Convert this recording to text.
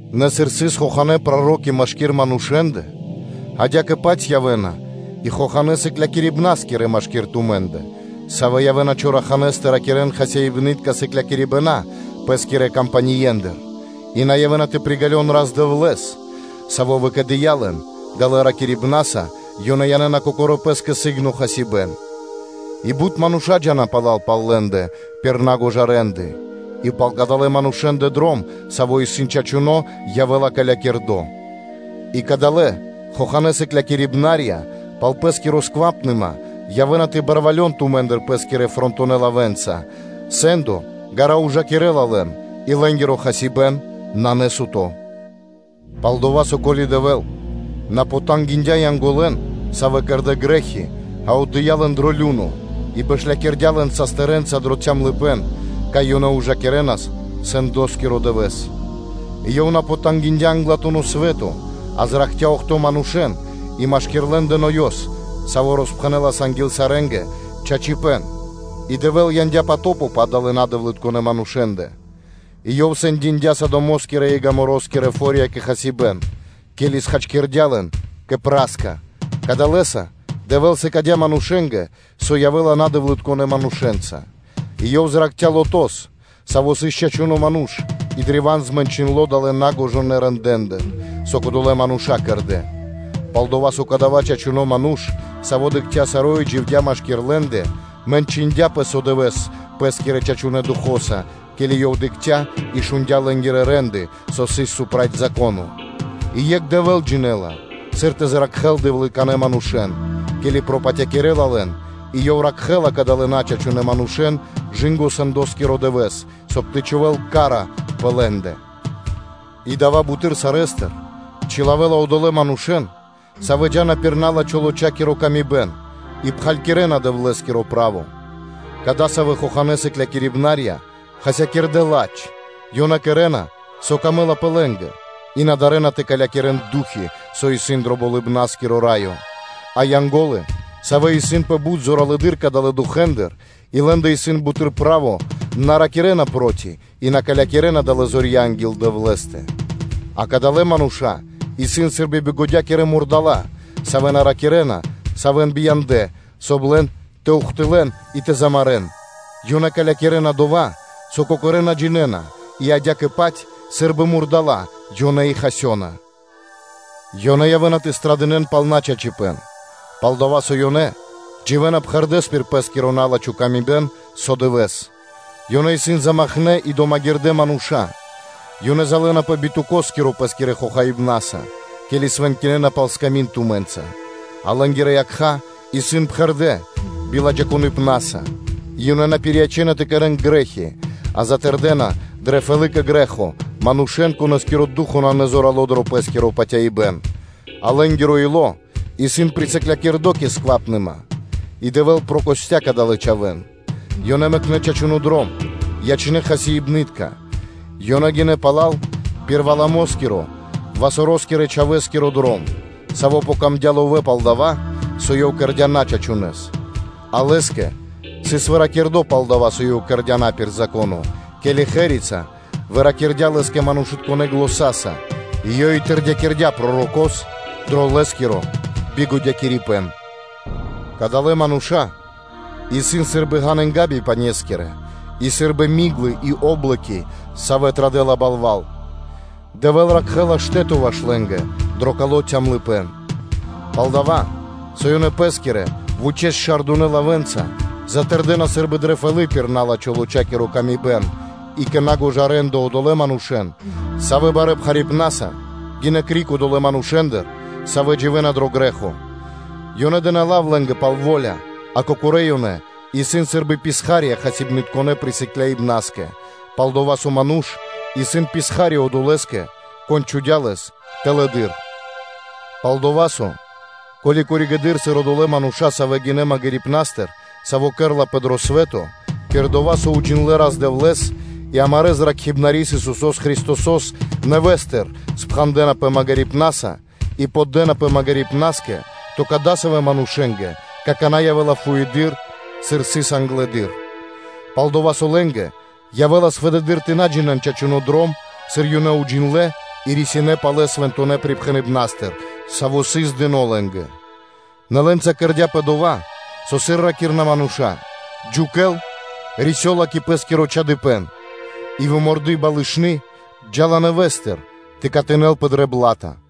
Нэ сыр сыс хоханэ́ проро́ки машки́р манушэ́ндэ, адя́кэ-паць явэ́на и хоханэ́ сыклякирибнаскирэ машки́р тумэ́ндэ, савэ́ явэ́на чораханэ́с тэ ракирэ́н хасибны́тка сыклякирибэна пэ́скирэ кампаниендыр и на явэ́на тэ приґалён Рас-Дэвлэ́с, Саво́ выкиндя лэн, далэ́ ракирибнаса ёнэ янэ́на кокорэ́ пэ́скэ сы́гно хасибэ́н; и бут мануша́ джа́на пала́л пал лэ́ндэ пир на́гожа рэ́нды (де́лы), и пал кадалэ́ манушэ́ндэ дром, саво́ исын чачуно́, явэ́ла калякирдо. И кадалэ́ хоханэ́ сыклякирибнарья пал пэ́скири скэмпима явэ́на тэ барвалён тумэ́ндыр пэ́скирэ фрэнтонэ лавэ́нца, сэ́ндо ґара́ ужакирэ́ла лэн и лэ́нгиро хасибэ́н исын насуто. Пал-дова́ со ко́ли Дэвэ́л на потангиндя Янголэн, савэ́ кэрдэ́ грэ́хи, а отдыя́ лэн дро лю́но (адо), и бэшлякирдя лэн састырэнца дро цямлыпэ́н, кай ёнэ ужакирэ́на сэндоскиро дывэ́с; и Ёв на потангиндя (на пожалиндя) англатуно́ свэ́то, а зракхця́ охто́ (бидуе́нгиро дэш) манушэ́н и машки́р лэ́ндэ Ноёс, саво́ роспхэнэлас анги́л сарэ́нгэ чачипэ́н и Дэвэ́л яндя́ потопо пэ адалэ́ надэвлытконэ манушэ́ндэ; и Ёв сэндякирдя Содомо́скирэ и Гоморакирэ фо́рья кэ хасибэ́н, ке́ли хачкирдя́ лэн кэ пра́ска (пепло). Кадалэса Дэвэ́л сыкадя́ манушэ́нгэ, со явэ́ла надэвлытконэ манушэ́нца; и Ёв зракхця́ Лотос, саво́ сыс чачуно́ ману́ш и древа́н змэнчындло далэ́ нагожонэ рэндэ́ндыр, со кодолэ́ мануша́ кэрдэ́, пал-дова́ со кадава́ чачуно́ ману́ш, саво́ дыкхця́ саро́ и дживдя́ машки́р лэ́ндэ, мэнчындяпэ со дывэ́с пэ́скирэ чачунэ́ духо́са, ке́ли ёв дыкхця́ и шундя́ лэ́нгирэ рэ́нды, со сыс проти Зако́но. И екх Дэвэ́л джинэ́ла, сыр тэ зракхэ́л дэвлытконэ́ манушэ́н, ке́ли пропатякирэна лэн, и Ёв ракхэ́ла кадалэ́ начачунэ манушэ́н кэ / жы́ко сэндоскиро дывэ́с, соб (кай) тэ чхувэ́л ка́ра пэ лэ́ндэ; и дава́ буты́р сарэ́стыр чилавэ́ла одолэ́ манушэ́н, савэ́ джа́на пир на́лачхо лочакиро камибэн и пхагирэна Дэвлэ́скиро право. Кадасавэ́ хоханэ́ сыклякирибнаскирэ хасякирдэ́ ладж, ёнэ кэрэ́на, со исын пир годы́ лэ́нгэ и на дарэ́на тэ калякирэн ду́хи, савэ́ исын дро Болыбна́скиро Раё. А Янго́лы, савэ́ исын пэ бут зоралэды́р кадалэ́ духэ́ндыр и лэ́ндэ исын буты́р право, на ракирэ́на проти и на калякирэна далэ́ зорья анги́л Дэвлэ́стэ. А кадалэ́ мануша́ исын сы́рбы бигодякирэ мурдала́, савэ́ на ракирэ́на, савэ́ бия́ндынэ, соб (кай) лэн тэ ухтылэ́н и тэ замарэ́н; ёнэ калякирэна дова́, со кокорэ́ на джинэ́на, и адя́кэ-паць сы́рбы мурдала́, ёнэ и хасёна, ёнэ явэ́на тэ пирилыджан пхарипэ́н пал начачипэ́н, пал дова́ со ёнэ дживэ́на пхэрдэ́с пир пэ́скиро на́лачхо камибэн со дывэ́с. Ёнэ исын замакхнэ и домагирдэ мануша́; ёнэ залэнапэ битукоскиро пэ́скирэ хохаибнаса, ке́ли свэнкинэна пал сками́нд тумэ́нца; а лэ́нгирэ якха́ исын пхэрдэ́ биладжаипнаса и ёнэ на пириячэна тэ кэрэ́н грэ́хи, а затэрдэна дрэ фэлы́ кэ грэ́хо манушэ́н, конэ́скиро ду́хо (фа́но) исын назорало дро пэ́скиро патяибэ́н, а лэ́нгиро ило́ исын присыклякирдо кэ скэмпима, и Дэвэ́л прокостя кадалэ́ чхавэ́н; ёнэ мэкнэ́ чачуно́ дром, ёнэ ячнэ́ хасибны́тка; ёнэ гинэ́ пала́л пир Валамоскиро, Васороскирэ-чхавэ́скиро дром, саво́ тырдыяпэ кэ ловэ́ пал дова́, со ёв кэрдя́ начачунэс, а лэ́скэ сыс выракирдо пал дова́, со ёв кэрдя́ на пир Зако́но, ке́ли ослица выпхэндя банг (пининдя) лэ́скэ манушытконэ́ заня́са, ёй и тэрдякирдя пророко́с дро лэ́скиро бигодякирибэн. Кадалэ́ мануша́ исын сы́рбы ґанынга́ бипанескирэ и сы́рбы миглы и о́блоки, савэ́ традэ́ла балва́л, Дэвэ́л ракхэ́ла штэ́то ваш лэ́нгэ дро кало́ цямлыпэ́н. Палдава́ со ёнэ пэ́скирэ вучэ́с-шардунэ лавэ́нца затэрдэна сы́рбы дрэ фэлы́ пир на́лачхо лочакиро камибэн и кэ на́гожа рэ́нды одолэ́ манушэ́н, савэ́ барэ́ пхарипнаса гинэ́ криг одолэ́ манушэ́ндыр, савэ́ дживэ́на дро грэ́хо; ёнэ дэ́на лав лэ́нгэ пал во́ля, а кокорэ́ ёнэ исын сы́рбы писха́рья хасибнытконэ присыкляибнаскэ, пал-дова́ со ману́ш исын писха́ри одолэ́скэ, кон чхудя́ лэс тэлэды́р. Пал-дова́ со, ко́ли одолэ́ мануша́, савэ́ вари-ке́ли гинэ́ магирипнастыр, саво́ кэрэ́лапэ дро свэ́то, пир дова́, со ёнэ уджиндлэ́ Рас-Дэвлэ́с и амарэ́ Зракхибнарис Исусо́с Христосо́с, нэвэ́стыр спхандэнапэ магирипнаса и поддэнапэ магирипнаскэ, то кадасавэ́ манушэ́нгэ какана́ явэ́ла фуеды́р, сыр сыс англэды́р. Пал-дова́ со лэ́нгэ явэ́лас фэды́р тэ на джинэ́н чачуно́ дром, сыр ёнэ уджиндлэ́ и рисинэ́ палэ свэнтонэ́ припхэныбнастыр, саво́ сыс дыно́ лэ́нгэ. Нэ лэ́нца кэрдя́пэ дова́, со сыр ракирэ́на мануша́: “Джукэл рисёла кэ пэ́скиро чадыпэн”, и “выморды балышны джа́ла нэвэ́стыр тэ катынэлпэ дрэ бла́та.”